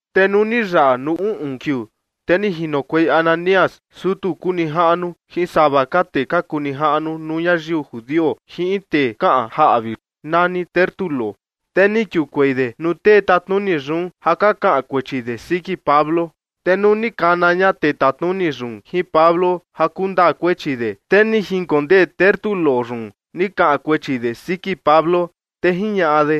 Te nuu ni yaꞌa nuu uꞌun kiuu, te ni jinokuei Ananías, sutu kuu nijaꞌnu, jin sava ka tee ka kuu nijaꞌnu nuu ñayiu judio jin in tee kaꞌan jaꞌvi nani Tértulo. Te ni kiukuei de nuu tee tatnuni yun ja ka kaꞌan kuechi de siki Pablo. Te nuu ni kana ña tee tatnuni yun jin Pablo ja kundaa kuechi de, te ni jinkondee Tértulo yun ni kaꞌan kuechi de siki Pablo, te jiñaꞌa de: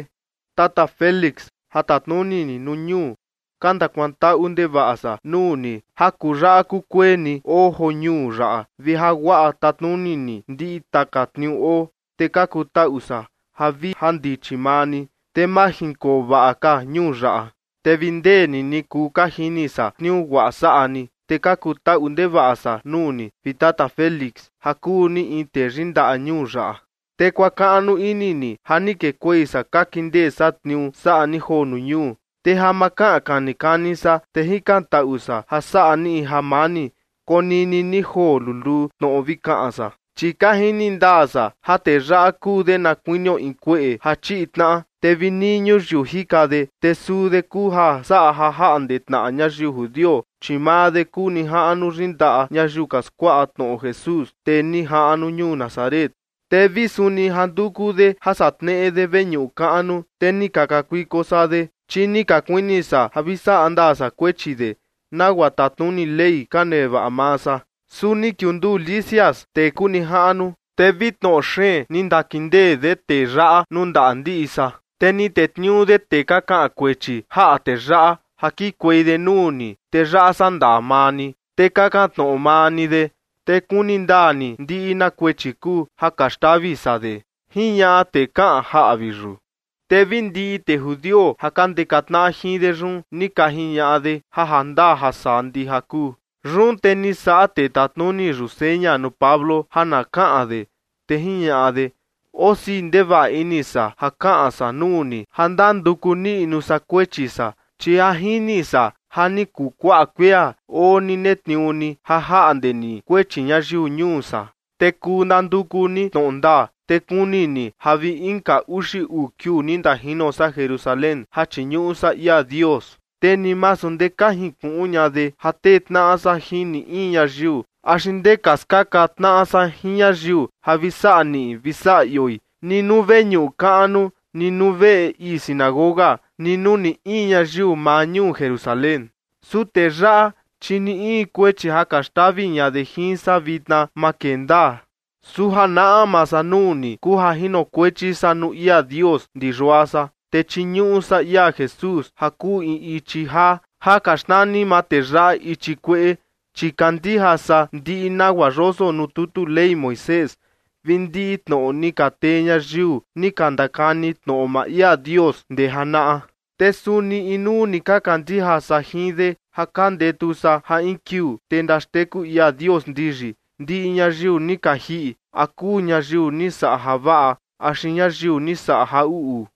―Tata Félix, ja tatnuni ni nuu ñuu, ka ndakuantaꞌu ndevaꞌa san nuu ni ja kuyaꞌa kukueni oo joo ñuu yaꞌa vi ja guaꞌa tatnuni ni ndiꞌi taka tniuu oo, te ka kutaꞌu san ja vi jandichi maa ni, te majinkoo vaꞌa ka ñuu yaꞌa. Te vi ndee ni ni kuu ka jini san tniuu guaꞌa saꞌa ni, te ka kutaꞌu ndevaꞌa san nuu ni, vi Tata Félix, ja kuu ni in tee yindaꞌa ñuu yaꞌa. Te kuakaꞌnu ini ni ja ni kekuei san ka kindee san tniuu saꞌa ni joo nuu ñuu. Te ja ma kaꞌan kani kani san, te jikantaꞌu san ja saꞌa ni jamani, konini ni joo luluu tnoꞌo vi kaꞌan san. Chi ka jini ndaa san ja tee yaꞌa kuu de na kuinio in kueꞌe ja chiꞌi tnaꞌa, te vi nii ñuyiu jika de, te suu de kuu ja saꞌa ja jaꞌnde tnaꞌa ñayiu judio, chi maa de kuu nijaꞌnu yindaꞌa ñayiu ka skuaꞌa tnoꞌo Jesús, tee ni jaꞌnu ñuu Nazaret. Te vi suni ja nduku de ja saꞌa tneꞌe de veñuꞌu kaꞌnu, te ni ka kakuiko san de, chi ni ka kuini san ja vi saꞌa ndaa san kuechi de, nagua tatnuni Ley ka nevaꞌa maa san. Su ni kiunduu Lisias, tee kuu nijaꞌnu, te vi tnoꞌo xeen ni ndakindee de tee yaꞌa nuu ndaꞌa ndiꞌi san. Te ni tetniuu de tee ka kaꞌan kuechi jaꞌa tee yaꞌa ja kikuei de nuu ni, te yaꞌa saꞌa ndaa maa ni. Te kakan tnoꞌo maa ni de, te kuni ndaa ni ndiꞌi na kuechi kuu ja ka xtavi san de ―jiñaꞌa tee kaꞌan jaꞌvi yun. Te vi ndiꞌi tee judio ja ka ndeka tnaꞌa jin de yun ni ka jiñaꞌa de ja ndaa ja saa ndija kuu. Yun te ni saꞌa tee tatnuni yun seña nuu Pablo ja na kaꞌan de, te jiñaꞌa de: ―Osii ndevaꞌa ini san ja kaꞌan san nuu ni, ja ndanduku niꞌnu san kuechi san, chi ja jini san ja ni kuu kuaꞌa kuia oo ni netniuu ni ja jaꞌnde ni kuechi ñayiu ñuu san. Te kuu ndanduku ni tnoꞌo ndaa, te kuni ni ja vi inka uxi uu kiuu ni ndajino san Jerusalén ja chiñuꞌu san ia Dios. Te ni masu ndee ka jinkuꞌun ña de ja tee tnaꞌa san jin ni in ñayiu axi ndee ka skaka tnaꞌa san jin ñayiu ja vi saꞌa niꞌi vi saꞌa ioi, ni nuu veñuꞌu kaꞌnu, ni nuu veꞌe ii sinagoga, ni nuu ni in ñayiu maa ñuu Jerusalén. Su tee yaꞌa, chi ni in kuechi ja ka xtavi ña de jin san vitna, ma kee ndaa. Su ja naꞌma san nuu ni kuu ja jinokuechi san nuu ia Dios ndi yua san, te chiñuꞌu san ia Jesús ja kuu in ichi jaa ja ka xnani maa tee yaꞌa ichi kueꞌe, chi kandija san ndiꞌi nagua yoso nuu tutu Ley Moisés vi ndiꞌi tnoꞌo ni ka tee ñayiu ni ka ndakani tnoꞌo maa ia Dios ndee janaꞌa. Te suni inuu ni ka kandija san jin de, ja ka ndetu san ja in kiuu, te ndaxteku ia Dios ndiyi, ndiꞌi ñayiu ni ka jiꞌi, a kuu ñayiu ni saꞌa javaꞌa axi ñayiu ni saꞌa ja uꞌu.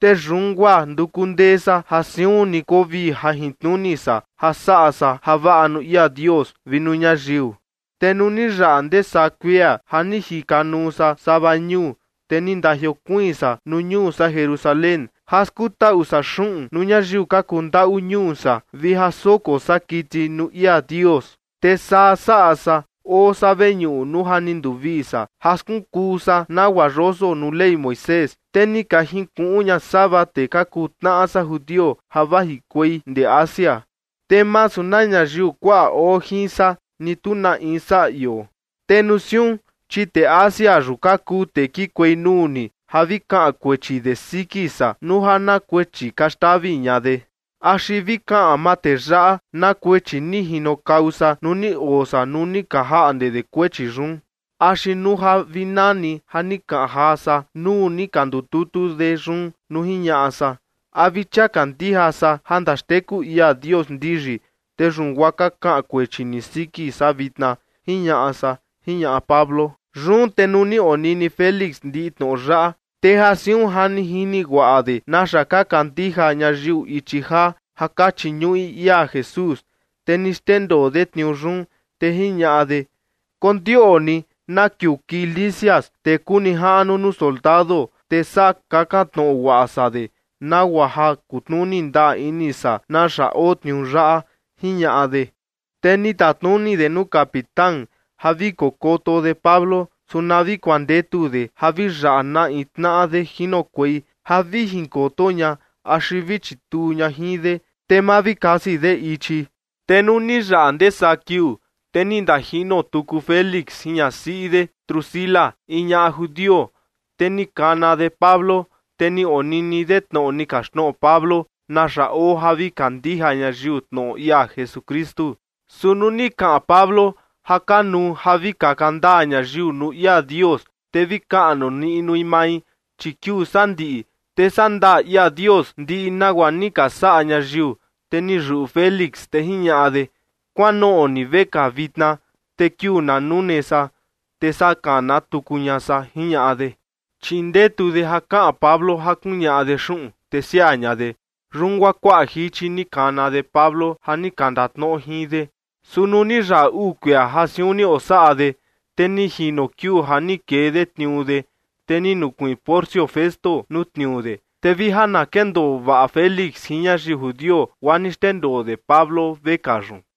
Te yun guaa nduku ndee san ja siun ni koo vii jajintnuni san ja saꞌa san javaꞌa nuu ia Dios vi nuu ñayiu. Te nuu ni yaꞌa ndee saa kuia ja ni jikanuu san sava ñuu, te ni ndajiokuiin san nuu ñuu san Jerusalén ja skutaꞌu san xuꞌun nuu ñayiu ka kuu ndaꞌu ñuu san vi ja soko san kiti nuu ia Dios. Te saa saꞌa san, oo san veñuꞌu nuu ja ni nduvii san ja skunkuu san nagua yoso nuu Ley Moisés, te ni ka jinkuꞌun ña sava tee ka kuu tnaꞌa san judio ja vajikuei ndee Asia. Te masu na ñayiu kuaꞌa oo jin san ni tu na in saꞌa ioo. Te nuu siun, chi tee Asia yun ka kuu tee kikuei nuu ni ja vi kaꞌan kuechi de siki san nuu ja na kuechi ka xtavi ña de. Axi vi kaꞌan maa tee yaꞌa na kuechi ni jinokau san nuu ni oo san nuu ka jaꞌnde de kuechi yun. Axi nuu ja vi nani ja ni kaꞌan jaa san nuu ni ka ndututu de yun nuu jiñaꞌa san: “A vi chia kandija san ja ndaxteku ia Dios ndiyi, te yun guaa ka kaꞌan kuechi ni siki san vitna” jiñaꞌa san ―jiñaꞌa Pablo. Yun te nuu ni onini Félix ndiꞌi tnoꞌo yaꞌa, te ja siun ja ni jini guaꞌa de naxa ka kandija ñayiu ichi jaa ja ka chiñuꞌi ia Jesús, te ni xndendoo de tniuu yun, te jiñaꞌa de: ―Kondioꞌni na kiuu kii Lisias, tee kuu nijaꞌnu nuu soldado, te saa kakan tnoꞌo guaꞌa san de, nagua ja kutnuni ndaa ini san naxa oo tniuu yaꞌa ―jiñaꞌa de. Te ni tatnuni de nuu capitán ja vi kokoto de Pablo, su na vi kuandetu de ja vi yaꞌa na in tnaꞌa de jinokuei ja vi jinkoto ña axi vi chituu ña jin de, te ma vi kasi de ichi. Te nuu ni yaꞌa ndee saa kiuu, te ni ndajino tuku Félix jin ñasiꞌi de Drusila, in ñaꞌa judio, te ni kana de Pablo, te ni onini de tnoꞌo ni kaxtnoꞌo Pablo naxa oo ja vi kandija ñayiu tnoꞌo ia Jesukristu. Su nuu ni kaꞌan Pablo ja kanuu ja vi kaka ndaa ñayiu nuu ia Dios, te vi kaꞌnu niꞌnui mai, chi kiuu sandiꞌi, te saꞌa ndaa ia Dios ndiꞌi nagua ni ka saꞌa ñayiu, te ni yuꞌu Félix, te jiñaꞌa de: ―Kuanoꞌo ni vekaa vitna, te kiuu na nune san, te saa kana tuku ña san ―jiñaꞌa de. Chi ndetu de ja kaꞌan Pablo ja kuñaꞌa de xuꞌun, te siaa ña de. Yun guaa kuaꞌa jichi ni kana de Pablo ja ni ka ndatnoꞌo jin de. Su nuu ni yaꞌa uu kuia ja siun ni osaꞌa de, te ni jino kiuu ja ni kee de tniuu de, te ni nukuiin Porcio Festo nuu tniuu de. Te vi ja na kendoo vaꞌa Félix jin ñayiu judio, guaa ni xndendoo de Pablo vekaa yun.